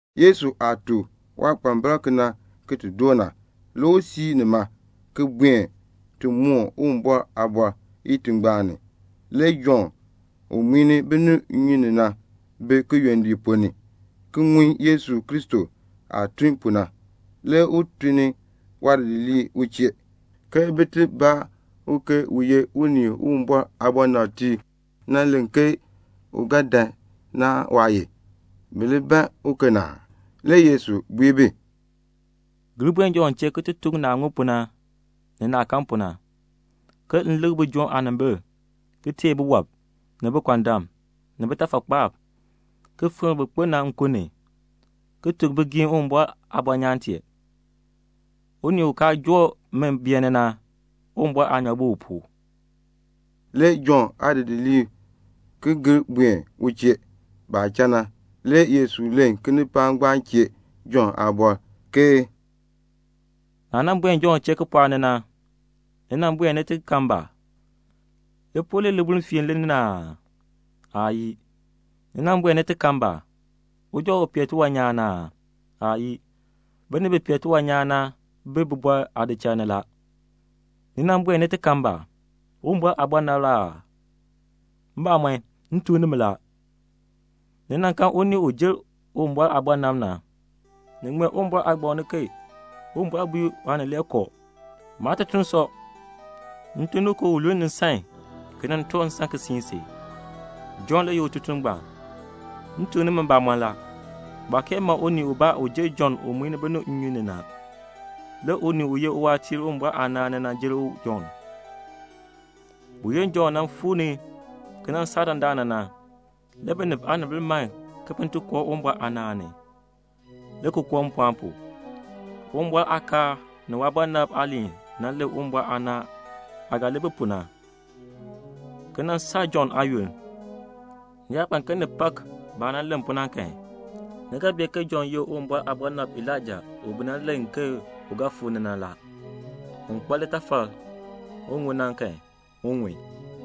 Yesu aah tuk waadidiliib kena ki ti doo na, le u siir nima, ki buen ti moon Uwumbɔr aaliin itingbaan ni. Le Jɔnn u muin binib nnyun ni na bi kiyondiik ponn ni ki ŋun Yesu Kristo aah tun pu na. Le u tun ni waadidiliib u chee ke bin ti baa u ke u ye unii u Uwumbɔr aabɔnabtiib nan len ke u ga dan na aan waa ye? Bi li ban uken aa? Le Yesu bui bi, "Gir buen Jɔnn chee ki ti tuk u naah ŋun pu na, ni naah kan pu na: ke m likr bijoom aanimbil, ki teei biwɔb, ni bikɔndam, ni bitafakpaab, ki fikr bin kpo na nkun ni, ki tuk bigiim Uwumbɔr aabɔnyaan tee. Unii u kaa joo mi beeni na, Uwumbɔr aanyoor bi u pu." Le Jɔnn aadidiliib ki gir buen u chee. Baah cha na, le Yesu len kinipaak ngbaan chee Jɔnn aabɔr, ke "Naah nan buen Jɔnn chee kipɔɔk ni na, ni buen ni ti kan ba? Lipul li libuln fiini li na aa? Aayii. Ni buen ni ti kan ba? Uja u pee tiwan nyaan na aa? Aayii. Binib bi pee tiwan nyaan na bi bibɔrb aadichal ni la. Ni buen ni ti kan ba? Uwumbɔr aabɔnabr la aa? Mbamɔn, m tuk nimi la, ni kan unii u jer Uwumbɔr aabɔnabr na. Ni ŋmee Uwumbɔr Aagbaŋ ni, ke Uwumbɔr bui Waanileekoo, 'Maatutuln sɔ. M tun ni u ke un luln nsan ki nan toor nsan ki siin si.' Jɔnn le ye ututuln ngbaan. M tuk nimi mbamɔn la, baa kee ma unii ubaa u jer Jɔnn u muin binib nnyun ni na. Le unii u ye uwaatiir Uwumbɔr aanaan ni na, u jer Jɔnn. Buyoonn Jɔnn nan fuu ni ki nan saa dandana na, le binib aanimbil man bin ti koo Uwumbɔr aanaan ni, le ki koo mpɔɔn pu. Uwumbɔr aakaal ni waabɔnabtiib aaliin nan len Uwumbɔr aanaan aah ga li bi pu na, ki nan saa Jɔnn aayoonn. Ni yaa ban ke ni pak baah nan len pu na kan, ni ga bee ke Jɔnn ye Uwumbɔr aabɔnabr Elaija u bi nan len ke u ga fuu ni na. Un kpa litafal un ŋun na kan, un ŋun.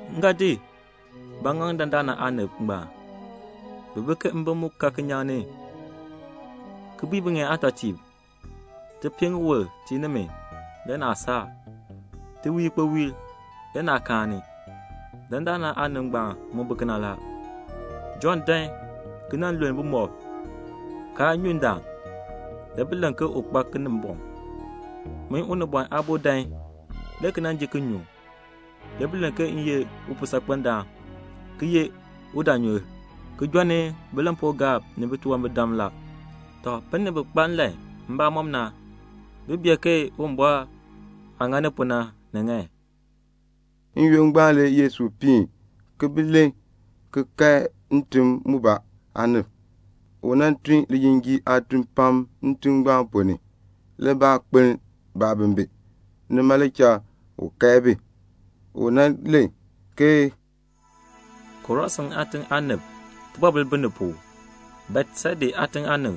"M ga di ba ki di ŋaŋ dandana aanib ngbaan? Bi bi ke mbim mu ka kinyaŋ ni ki bui biŋeen aatɔtiib, 'Ti pii ŋiwul le ki tii nimi, le naa saar. Ti wii ikpowiil, le naa kaani.' Dandana aanib ngbaan mu bi kena la; Jɔnn dan ki nan lul bumɔb, kaa nyu ndaan, le bi len ke u kpa Kinimbɔŋ. Min Unibɔn Aabo dan le ki ji le ki nyu, le bi len ke m ye upuusaakpendaan ki ye udaanyur, ki jɔnni bilampuugaab ni titunwambirdam la. Tɔ, binib bi kpa nlan mbamɔm na, bi bee ke Uwumbɔr aah ŋani pu na, ni ŋan." N-yoonn ngbaan le Yesu piin ki bi len ki kae ntim mubaa aanib. U nan tun lijinjiir aatun pam ntim ngbaan ponn ni, le baa kpeln baabimbin. Nima le cha u kae bi. U len ke, "Korasin aatiŋ aanib, tibɔbil bi ni pu. Betseda aatiŋ aanib,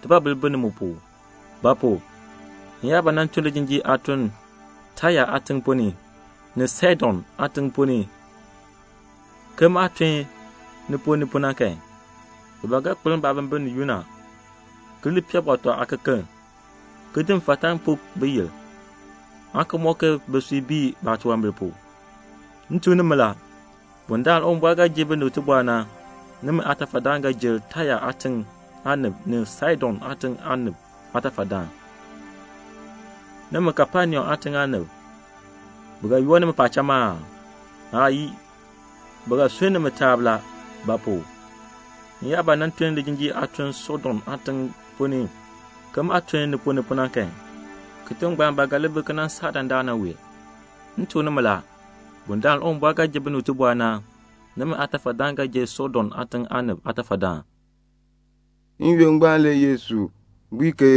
tibɔbil bi ni mu pu; ba pu? m yaa ba nan tun lijinjiir aatun Taya aatiŋ ponn ni, ni Saidon aatiŋ ponn ni ke maah tun ni ponn ni pu na kan, bi ba ga kpeln baabimbin ni yunn, ki li pee bɔtɔ aakekeln ki puk mfatan ki ŋa biyil pu, aan ki mɔk ke bisui bii baatunwambir pu. M tuk nimi la, bundaln Uwumbɔr ga ji binib tibɔr na, nimi aatafadaan ga li jer Taya aatiŋ aanib ni Saidon aatiŋ aanib aatafadaan. Nimi Kapenaum aatiŋ aanib, bi ga yoor nimi paacham aa? Aayii. Bi ga sunn nimi taab la; ba pu? m yaa ba nan tun lijinjiir aatun Sodom aatiŋ ponn ni ke maah tun ni ponn ni pu na kan, kitiŋ ngbaan ba ga li bi ki nan saa dandana wee. M tuk nimi la, bundaln Uwumbɔr ga ji binib tibɔr na, nimi aatafadaan ga li jer Sodom aatiŋ aanib aatafadaan." N-yoonn ngbaan le Yesu bui ke,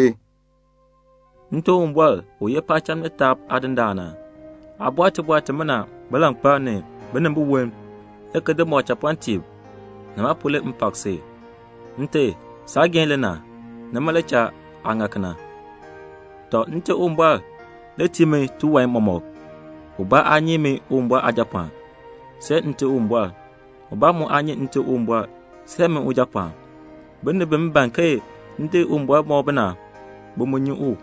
"Nte Uwumbɔr, u ye paacham ni taab Aadindaan na, aa bɔr tibɔr timina bilankpalb ni binimbiwolm, le ki di mɔk chapɔɔtiib, nima pu na le m pak si. Nte, saageehn le na, nima le cha aa ŋa kena. "Tɔ, Nte Uwumbɔr le tii mi tiwan mɔmɔk. Ubaa aa nyi min Uwumbɔr Aajapɔɔn, see Nte Uwumbɔr. Ubaa mu aa nyi Nte Uwumbɔr, see min Ujapɔɔn. Binib bi m ban ke m di Uwumbɔr ki di mɔk bi na, bi mu nyi u.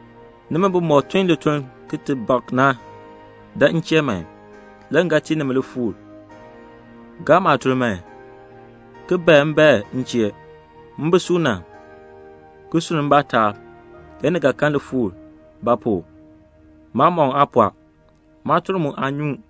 "Nimi bimɔk tun lituln ki ti bak na, dan m chee man, le m ga tii nimi lifuur. Gaa maatuln man, ki bae mbaen m chee; m bi suuna, ki sunn mbaa taab. Le ni ga kan lifuur; ba pu? maamɔkm aa pɔɔ. Maatuln mu aa nyuun."